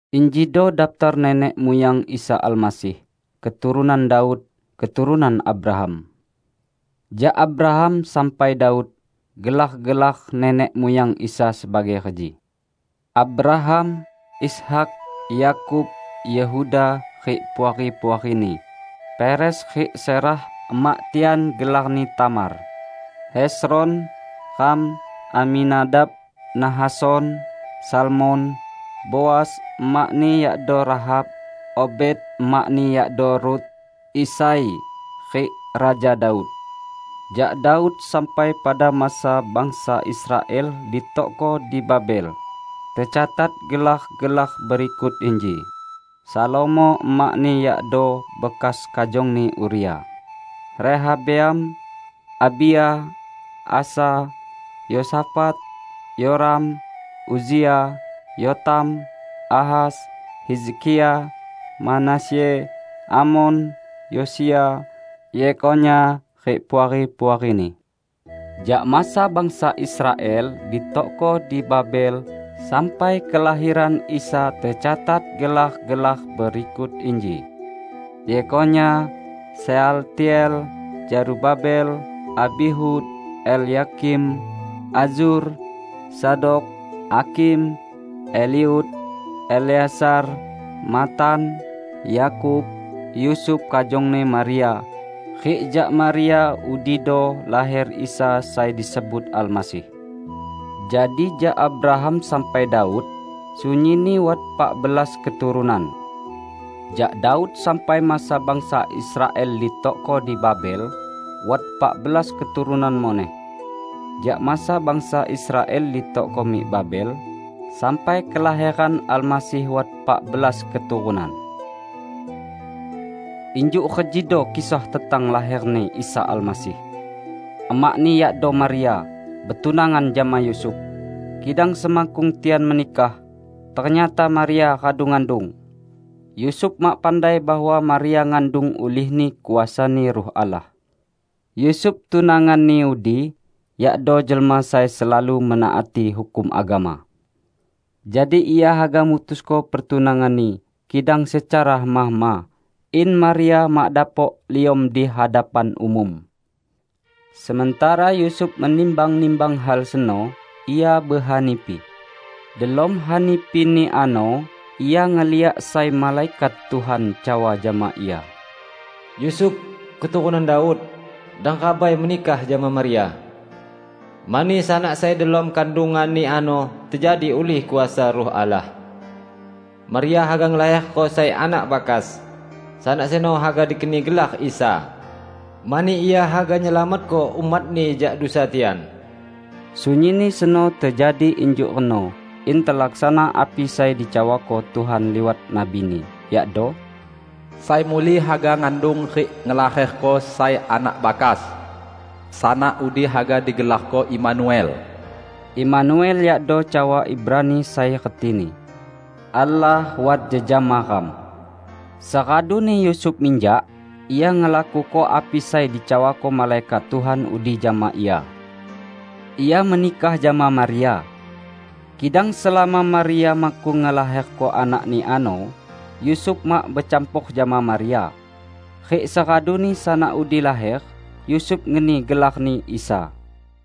Injido daptar nenek muyang Isa Almasih, keturunan Daud, keturunan Abraham. Jak Abraham sampai Daud, gelar-gelar nenek muyang Isa sebagai reji: (2-6a) Abraham, Ishak, Yakub, Yehuda rik puari-puarini, Peres rik Zerah (emak tian gelarni Tamar), Hezron, Ram, Aminadab, Nahason, Salmon, Boas (emakni yakdo Rahab), Obed (emakni yakdo Rut), Isai, rik Raja Daud. ( b-11) Jak Daud sampai pada masa bangsa Israel ditokko di Babel tecatat gelar-gelar berikut inji: Salomo (emakni yakdo bekas kajongni Uria), Rehabeam, Abia, Asa, Yosafat, Yoram, Uzia, Yotam, Ahas, Hizkia, Manasye, Amon, Yosia, Yekhonya rik puari-puarini. 12Jak masa bangsa Israel ditokko di Babel sampai kelaheran Isa tecatat gelar-gelar berikut inji: Yekhonya, Sealtiel, Zerubabel, Abihud, Elyakim, Azur, Zadok, Akhim, Eliud, Eleazar, Matan, Yakub, Yusuf kajongni Maria. Rik jak Maria udido laher Isa sai disebut Almasih. 17Jadi jak Abraham sampai Daud, sunyinni wat pak belas keturunan. Jak Daud sampai masa bangsa Israel ditokko di Babel wat epak belas keturunan muneh. Jak masa bangsa Israel ditokko mik Babel sampai kelaheran Almasih wat pak belas keturunan. 18Injuk rejido kisah tentang laher-Ni Isa Almasih. Emak-Ni yakdo Maria, betunangan jama Yusuf. Kidang semakkung tian menikah, ternyata Maria radu ngandung. (Yusuf mak pandai bahwa Maria ngandung ulihni kuasa-Ni Ruh Allah.) 19Yusuf, tunanganni udi, yakdo jelma sai selalu menaati hukum agama. Jadi ia haga mutusko pertunanganni, kidang secara hema-hema, in Maria mak dapok liom di hadapan umum. 20Sementara Yusuf menimbang-nimbang hal seno, ia behanipi. Delom hanipini ano, ia ngeliak sai malaikat Tuhan cawa jama ia, "Yusuf, keturunan Daud, dang rabai menikah jama Maria; mani sanak sai delom kandunganni ano tejadi ulih kuasa Ruh Allah. 21Maria haga ngelaherko sai anak bakas. Sanak seno haga dikeni gelar Isa, mani Ia haga nyelamatko umat-Ni jak dusa tian." 22Sunyinni seno tejadi injuk reno in telaksana api sai dicawako Tuhan liwat nabi-Ni, yakdo, 23"Sai muli haga ngandung rik ngelaherko sai anak bakas. Sanak udi haga digelarko Imanuel." (Imanuel yakdo cawa Ibrani sai retini, "Allah wat jejama ram".) 24Seraduni Yusuf minjak, ia ngelakuko api sai dicawako malaikat Tuhan udi jama ia. Ia menikah jama Maria. 25Kidang selama Maria makkung ngelaherko anakni ano, Yusuf mak becampor jama Maria. Rik seraduni sanak udi laher, Yusuf ngeni gelar-Ni Isa.